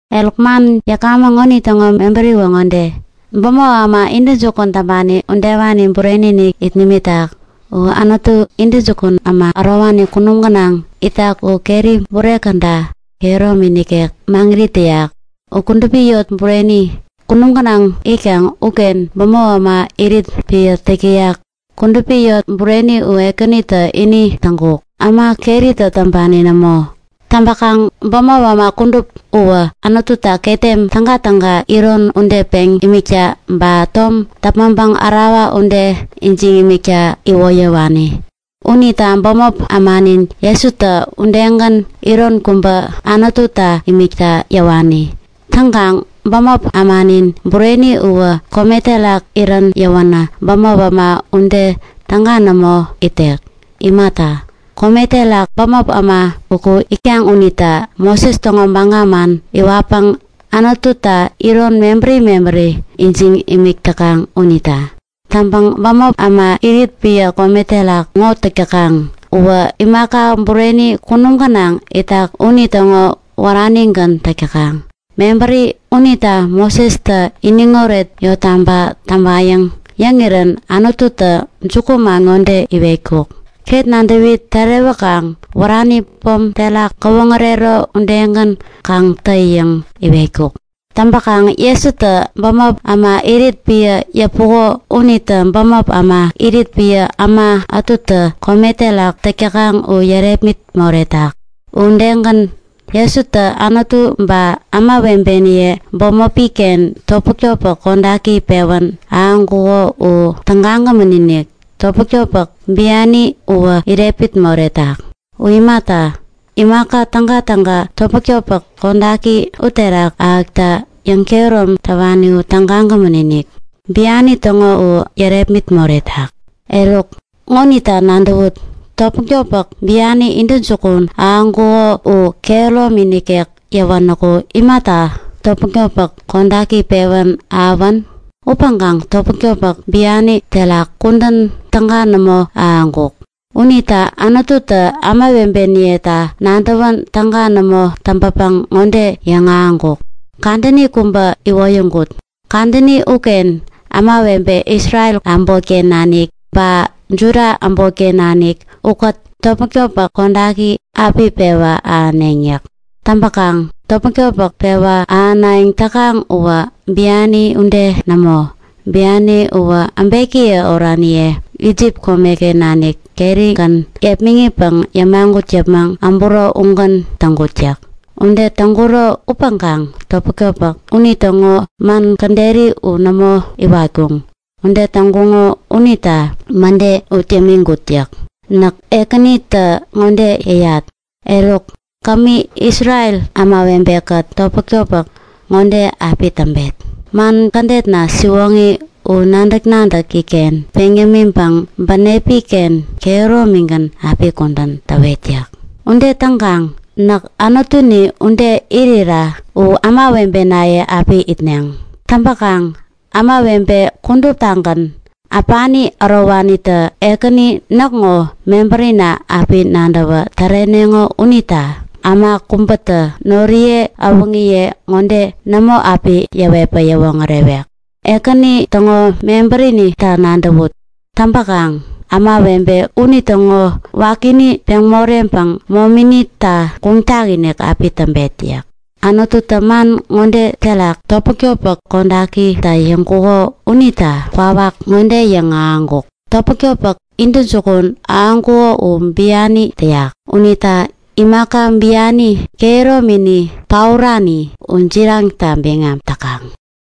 Eruk, man yäkamäŋ ŋonitäŋo mebäriwä ŋode; Bämop äma intäjukun täŋpani udewani bureni-inik it nimitak. U Anutu, intäjukun äma ärowani kunum gänaŋ itak u keri bure käda kehäromi nikek maŋirit täyak. U kudupi yot bureni, kunum gänaŋ itkaŋ uken bämop äma irit piä täk täyak. Kudupi yot bureni u Ekänitä ini täŋkuk, äma keritä täŋpani nämo. Täŋpäkaŋ bämop äma kudup uwä Anututa ketem tägatäga iron ude peŋ imikta ba tom däpmäŋpäŋ ärawa ude ijiŋ imikta iwoyäwani. Unita bämop ämanin Jesutä udegän iron kubä Anututa imikta yäwani. Täŋkaŋ bämop ämanin bureni uwä kome terak irän yäwänä bämop äma ude täga nämo itek. Imata, kome terak bämop äma uku itkaŋ unitä Moses täŋo baga man iwatpäŋ Anututa iron mebäri mebäri ijiŋ imik täkaŋ unita. Täŋpäŋ bämop äma irit piä kome terak ŋo täk täkaŋ uwä imaka bureni kunum gänaŋ itak unitäŋo wäranigän täk täkaŋ. Mebäri unita Mosestä iniŋoret yottaba täŋpayäŋ yäŋirän Anututä jukuman ŋode iwetkuk; Ket nadäwi tärewäkaŋ wärani pom terak gäwoŋärero udegän kaŋ tä yäŋ iwetkuk. Täŋpäkaŋ Jesutä bämop äma irit piä yäpuko unitä bämop äma irit piä äma ätutä kome terak täk täkaŋ u yärepmit moretak. U udegän, Jesutä Anutu ba ämawebeniye bämopi-ken topmäk-topmäk kodaki pewän ahäŋkuŋo u tägagämän-inik, topmäk-topmäk biani uwä irepmit moretak. U imata, imaka tägatäga topmäk-topmäk kodaki uterak ahäkta yäŋkehärom täwani u tägagämän-inik, biani täŋo u yärepmit moretak. Eruk ŋonita nadäwut; Topmäk-topmäk biani intäjukun ahäŋkuko u kehäromi nikek yäwänäku imata topmäk-topmäk kodaki pewän ahäwän? Upäŋkaŋ topmäk-topmäk biani terak kudän täga nämo ahäŋkuk. Unita Anututä ämawebeniyeta nadäwän täga nämo täŋpäpäŋ ŋode yäŋahäŋkuk; Kadäni kubä iwoyäŋkut. Kadäni uken ämawebe Isrel äbotken nanik ba Juda äbotken nanik ukät topmäk-topmäk kodaki api pewa ahäneŋ yäk. Täŋpäkaŋ topmäk-topmäk pewa ahänayäŋ täkaŋ uwä biani ude nämo. Biani uwä äbekiye oraniye Isip komeken nanik kerigän yepmäŋitpäŋ yämagut yäpmäŋ äburo ugän täŋkut yäk. Ude täŋkuro upäŋkaŋ topmäk-topmäk unitäŋo man käderi u nämo iwatkuŋ. Ude täŋkuŋo unita mäde ut yämiŋkut yäk. Näk Ekänitä ŋode yäyat! Eruk, kämi Isrel ämawebe-kät topmäk-topmäk ŋode api täŋpet; Man kädetna siwoŋi u nadäk-nadäki-ken peŋ yämiŋpäŋ bänepi-ken kehäromigän api kudän täwet yäk. Ude täŋkaŋ näk Anutuni ude irira u ämawebenaye api itneŋ. Täŋpäkaŋ ämawebe kuduptagän, äpani ärowanitä Ekäni näkŋo mebärina api nadäwä täreneŋo unita äma kubätä noriye äwäŋiye ŋode nämo api yäwetpäŋ yäwoŋärewek; Ekäni täŋo mebärinita nadäwut. Täŋpäkaŋ ämawebe unitäŋo wakini peŋ moreŋpäŋ mominita guŋ takinik api täŋpet yäk. Anututä man ŋode terak topmäk-topmäk kodakita yäŋkuko unita kwawak ŋode yäŋahäŋkuk; Topmäk-topmäk intäjukun ahäŋkuko u biani täyak. Unita imaka biani, kehäromini paorani, u jiraŋta biŋam täkaŋ.